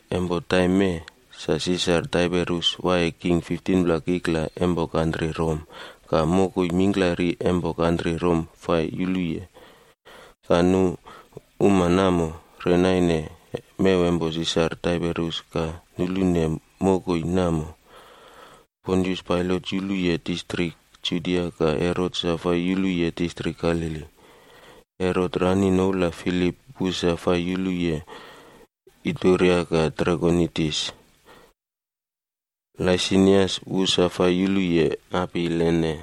Empo taim namo, sa Sisar Taiberius waiye king 15pla kikla empo kantri Rom ka mokoi mingklari empo kantri Rom fai yuluye. Ka nu uma namo, re naine mew empo Sisar Taiberius ka nulune mokoi namo: Pontius Pailat yuluye distrik Judia ka Herot sa fai yuluye distrik Galili. Herot rani noula Filip wu sa fai yuluye distrik Ituria ka Trakonitis. Laisenias wu sa fai yuluye Abilene.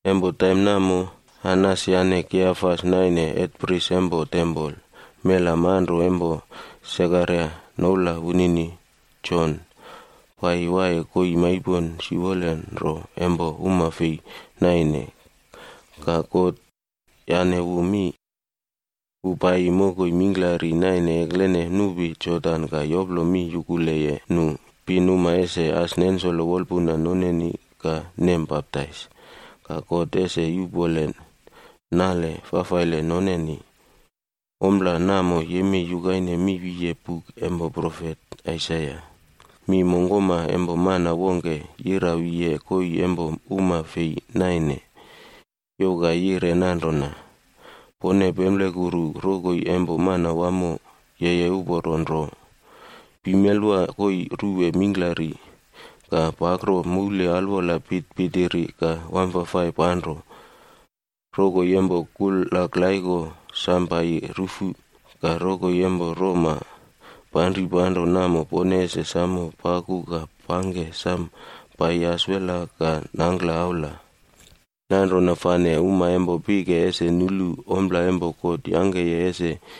Empo taim namo Anas yane Kaiafas naine hetprisa empo tempol. Mela manro empo Sekaraia noula wunini Jon paiyi waiye koii maipon siwolenro empo uma fei nainene ka God yane wu mi. Wu paiyi mokoi mingklari naine eklene nupi Jodan ka yoplo mi yukuleye nu pinuma ese as nensolo wolpuna noneni ka nem baptais, ka God ese yuꞌpone nale fafaile noneni. Ompla namo yemei yukaine mi wiye buk empo profet Aisaia: “Mi mongkoma empo mana wongke yira wiye koii empo uma fei naine, youw ka yire nanrona, ‘Pone pemplekuru rokoi empo Manawamo yeye uporo nro. Pimelwa koii ruwe mingklari ka pakro moule alwola pitpitiri ka wamfafai panro. Rokoi empo kulaklaiko sam paiyi ruꞌfu, ka rokoi empo roma panripanro namo pone ese samo paku ka pangke sam paiyi aselwa ka nangkla aula. Nanrona fane uma empo pike ese nulu ompla empo God yangkeye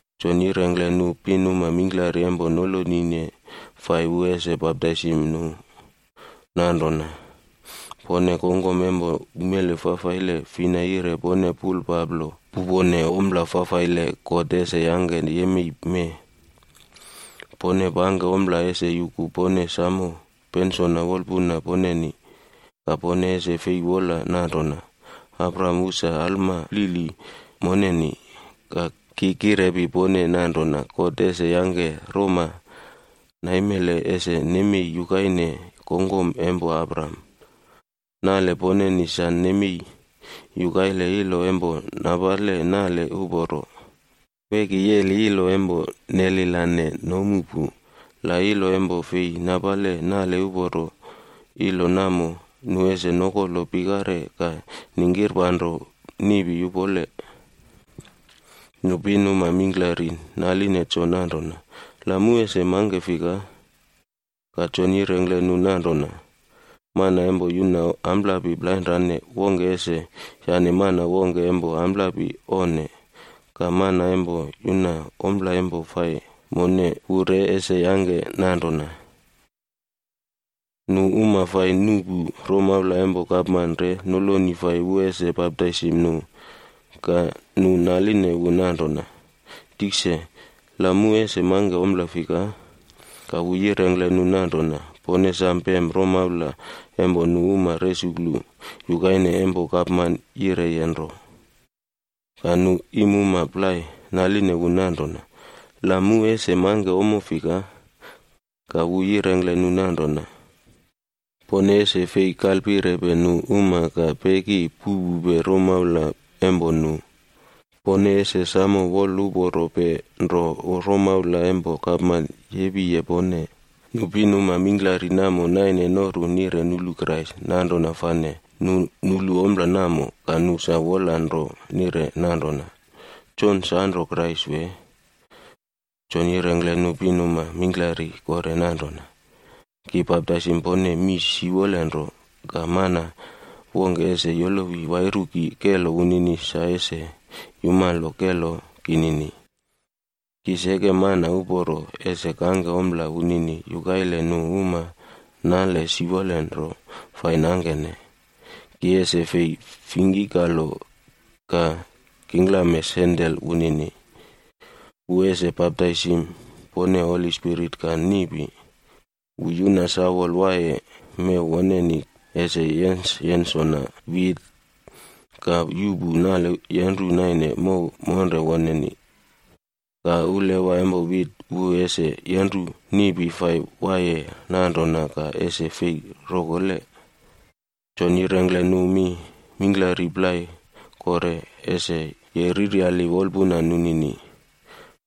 Jon yirengkle nu pinuma mingklari empo nolonine fai wu ese baptaisim nu nanrona, “Pone kongkom empo umele fafaile, fina yire pone pulpaplo pupone ompla fafaile God ese yangke yemei mee? Pone pangke ompla ese yuku pone samo pensona wolpuna poneni. Ka pone ese fei wola nanrona, ‘Abraham wu sa alma flili moneni.’ Ki kirepi pone nanrona God ese yangke roma naimele ese nemei yukaine kongkom empo Abraham. Nale poneni sa nemei yukaile ilo empo napale nale uporo. Weki yeli ilo empo neline nomu namo, la ilo empo fei napale nale uporo, ilo namo nu ese nokolo pikare ka ningkirpanro niꞌpi yupole.” Nu pinuma mingklari naline Jon nanrona, “La mu ese mangke fika?” Ka Jon yirengkle nu nanrona, “Mana empo yuna amplapi plainrane, wongke ese yane mana wongke empo amplapi onne. Ka mana empo yuna ompla empo fai none wu re ese yangke nanrona.” Nu uma fai nuꞌpu romaula empo gapman re noloni wu fai ese baptaisim nu. Ka nu naline wu nanrona, “Tikse, la mu ese mangke ompla fika?” Ka wu yirengkle nu nanrona, “Pone ese pem romaula empo nu uma resuklu yukaine empo gapman yireye nro.” Ka nu iimuma plai naline wu nanrona, “La mu ese mangke ommo fika?” Ka wu yirengkle nu nanrona, “Pone ese fei kalpirepe nu uma ka peki puꞌpupe romaula empo nu. Pone ese samo woluporope nro romaula empo gapman yapeye pone.” Nu pinuma mingklari wamo naine noru nire nulu Krais.c Nanrona fane nu nulu ompla namo, ka nu sa wola nro nire nanrona, “Jon sanro, Krais wee?” Jon yirengkle nu pinuma mingklari kore nanrona, “Ki baptaisim pone mii siwolenro, ka mana wongke ese yolowi wairu ki kelo wunini sa ese yumalo kelo kinini. Ki seke mana uporo ese kangke ompla wunini yukaile nu uma nale siwolenro fai nangkene, ki ese fei fingkikalo ka kingklame sandel wunini. Wu ese baptaisim pone Holi Spirit ka niꞌpi. Wu yuna sawol waiye mew woneni ese yensyensona wit ka yuꞌpu nale yenru naine mow monre woneni. Ka ulawa empo wit wu ese yenru niꞌpi fai waiye nanrona ka ese fei rokole.” Jon yoplongkle nu mi mingklari plai kore ese yereryali wolpuna nunini.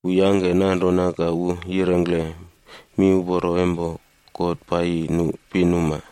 Wu yangke nanrona ka wu yirengkle miuporo empo God paiyi nu pinuma.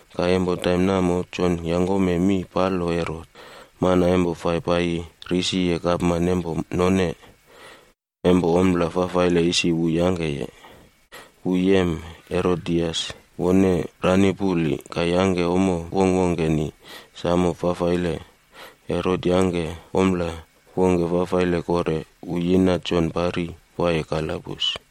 Ka empo taim namo, Jon yenre Herot, mana empo fai paiyi risiye gapman empo none, empo ompla fafaile isi wu yangkeye. Wu yem Herodias, wone rani puli, ka yangke ommo wongkwongkeni samo fafaile. Herot yangke ompla wongke fafaile kore, wu yina Jon pari waiye kalabus.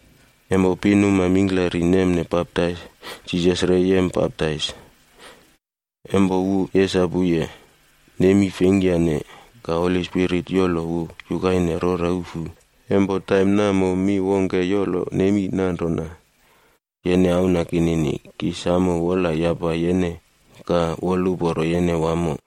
Empo pinuma mingklari nemne baptais, Jisas re yem baptais. Empo wu yesapuye, nemi fleingkyane. Ka Holi Spirit yolo wu yukaine rora ufu. Empo taim namo mi wongke yolo nemi nanrona, “Yene Auna kinini, ki samo wolayapa yene ka aiyem yene wamo.”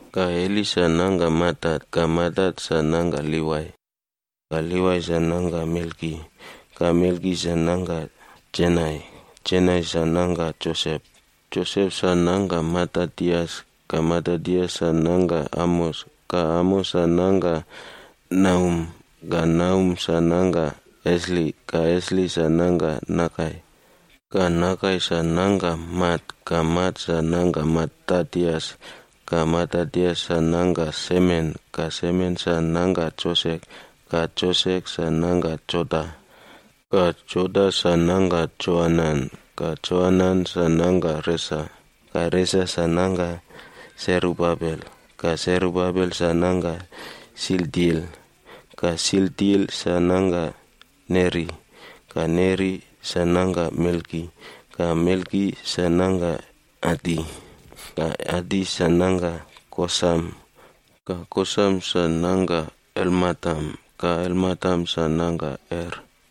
Ka Heli sa nangka Matat, ka Matat sa nangka Livai, ka Livai sa nangka Melki, ka Melki sa nangka Janai. Janai sa nangka Josep. Josep sa nangka Matatias, ka Matatias sa nangka Amos, ka Amos sa nangka Nahum, ka Nahum sa nangka Esli, ka Esli sa nangka Nagai. Ka Nagai sa nangka Mat, ka Mat sa nangka Matatias, ka Matatias sa nangka Semen, ka Semen sa nangka Josek, ka Josek sa nangka Joda. Ka Joda sa nangka Joanan, ka Joanan sa nangka Resa, ka Resa sa nangka Serubabel, ka Serubabel sa nangka Sealtiel, ka Sealtiel sa nangka Neri. Ka Neri sa nangka Melki, ka Melki sa nangka Adi, ka Adi sa nangka Kosam, ka Kosam sa nangka Elmadam, ka Elmadam sa nangka Er.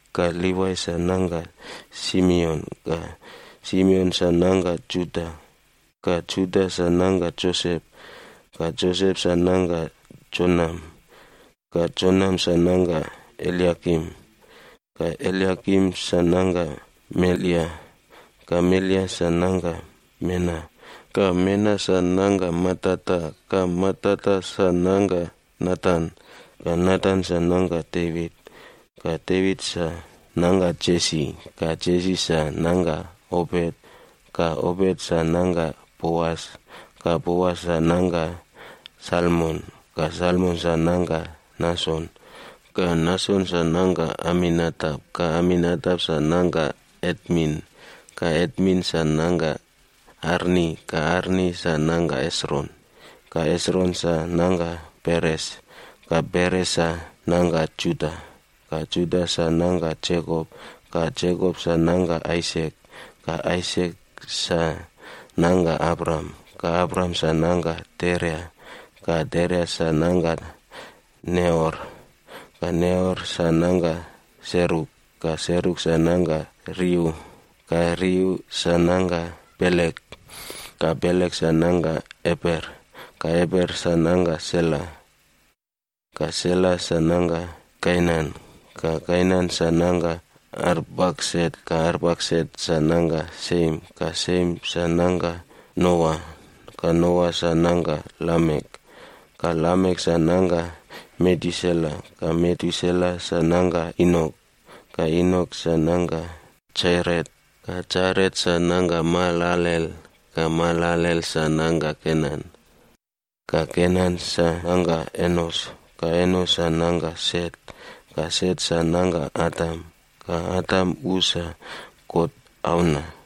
Ka Livai sa nangka Simeon, ka Simeon sa nangka Juda, ka Juda sa nangka Josep, ka Josep sa nangka Jonam, ka Jonam sa nangka Eliakim. Ka Eliakim sa nangka Melea, ka Melea sa nangka Mena, ka Mena sa nangka Matata, ka Matata sa nangka Natan, ka Natan sa nangka Devit. Ka Devit sa nangka Jesi, ka Jesi sa nangka Obet, ka Obet sa nangka Boas, ka Boas sa nangka Salmon, ka Salmon sa nangka Nason. Ka Nason sa nangka Aminadap, ka Aminadap sa nangka Atmin, ka Atmin sa nangka Arni, ka Arni sa nangka Hesron, ka Hesron sa nangka Peres, ka Peres sa nangka Juda. Ka Juda sa nangka Jekop, ka Jekop sa nangka Aisak, ka Aisak sa nangka Abraham, ka Abraham sa nangka Tera, ka Tera sa nangka Nahor. Ka Nahor sa nangka Seruk, ka Seruk sa nangka Reu, ka Reu sa nangka Pelek, ka Pelek sa nangka Eber, ka Eber sa nangka Sela. Ka Sela sa nangka Kainan, ka Kainan sa nangka Arpaksat, ka Arpaksat sa nangka Siem, ka Siem sa nangka Noa, ka Noa sa nangka Lamek. Ka Lamek sa nangka Metusela, ka Metusela sa nangka Enok, ka Enok sa nangka Jaret, ka Jaret sa nangka Mahalalel, ka Mahalalel sa nangka Kenan. Ka Kenan sa nangka Enos, ka Enos sa nangka Set, ka Set sa nangka Adam. Ka Adam wu sa God auna.